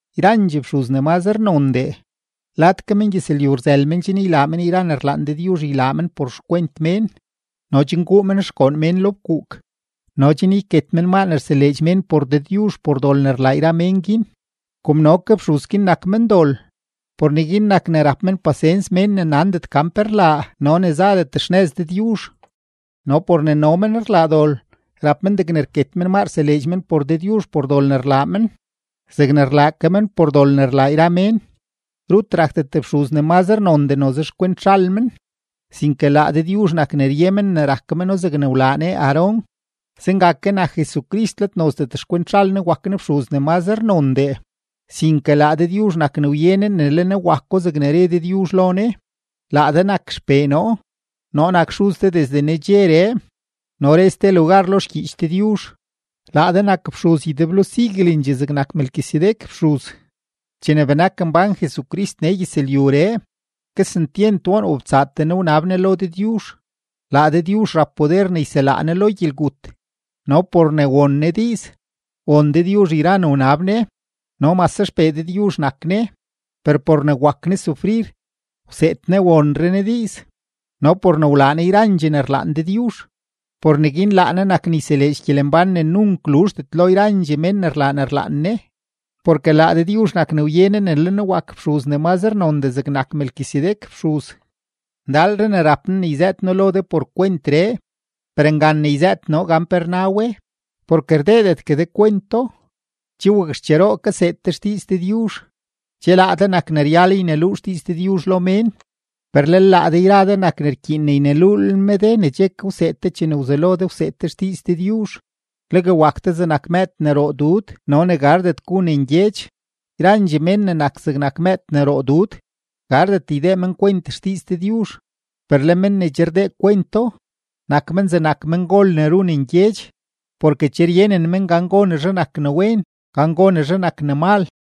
Yrandxee fxuz ne mazre nondee, lad ke mengyëzlyu rzël men chen ylaa men yra ne rlaan Dëdyuzh ylaa men por xkwent mén no chen guu men xgoon mén lo fkuuk no chen yket men maa ne rseleedx mén por Dëdyuzh por dol ne rlaa yra mén guin. Kom no ke fxuz guin nak mendol, por neguin nak ne rap men pasens mén ne nandet gan pe rlaa no ne zadet xnëz Dëdyuzh. No por ne no men rlaa dol, rap men degne rket men maa rseleedx men por Dëdyuzh por dol ne rlaa men zegne rlaa ke men por dol ne rlaa yra mén. Rut rakdet fxuz ne mazre nondee noze xkwent zhal men, sinke laa Dëdyuzh nak ne rye men ne rak meno zegne wlaa Ne Aarón. Zenga ke nak Jesucrist, let nozdet xkwent zhal Ne wak Ne fxuz ne mazre nondee, sinke laa Dëdyuzh nak ne wye Ne ne le Ne wako zegne re Dëdyuzh lo Ne: Laa de nak XPee noo; noo nak xuz de desde nedxeree. No re ste lugar lo xgyiich Dëdyuzh: Laa de nak fxuz ydeblo siguelendxee zegnak Melquisedec fxuz. Chene benak mbán Jesucrist nee gyëzlyuree, kesentyent woon wobtsaatee Ne wnab Ne lo Dëdyuzh, laa Dëdyuzh rap poder ne yselaa Ne lo gyelgut; no por ne won Ne diiz, won Dëdyuzh yra ne wnab Ne. No mase XPee Dëdyuzh nak Ne per por ne wak Ne sufrir, wseed Ne wonre Ne diiz. No por ne wlaa Ne yrandxee ne rlaan Dëdyuzh, por neguin laa Ne nak ne yseleedx gyelembán ne nunk luzhdet lo yrandxee men ne rlaa ne rlaan Ne, porke laa Dëdyuzh nak ne wye Ne ne le Ne wak fxuz ne mazre nondee zegnak Melquisedec fxuz. Ndalre ne rap noo ne yzëët noo lo de por kwentree, per ngan ne yzëët noo gan pe rna we, porke rdeedetgue de kwento. Che wakxcheroo kaseed de xdiiz Dëdyuzh, che laa de nak ne ryal yneluu xdiiz Dëdyuzh lo mén, per lel laa de yra de nak ne rkyiin ne yneluulel me de ne che ke wseed de chene wzelo de wseed de xdiiz Dëdyuzh, legue wak de zegnak mëëd ne roo dud no ne gardet gu ne ngyedx. Yrandxee mén ne nak zegnak mëëd ne roo dud, gardet ydee men kwent xdiiz Dëdyuzh. Per le men ne che rdee kwento, nak men zegnak mengol ne ru ne ngyedx, porke che ryenen men gan gonezhe nak ne wen, gan gonezhe nak ne mal.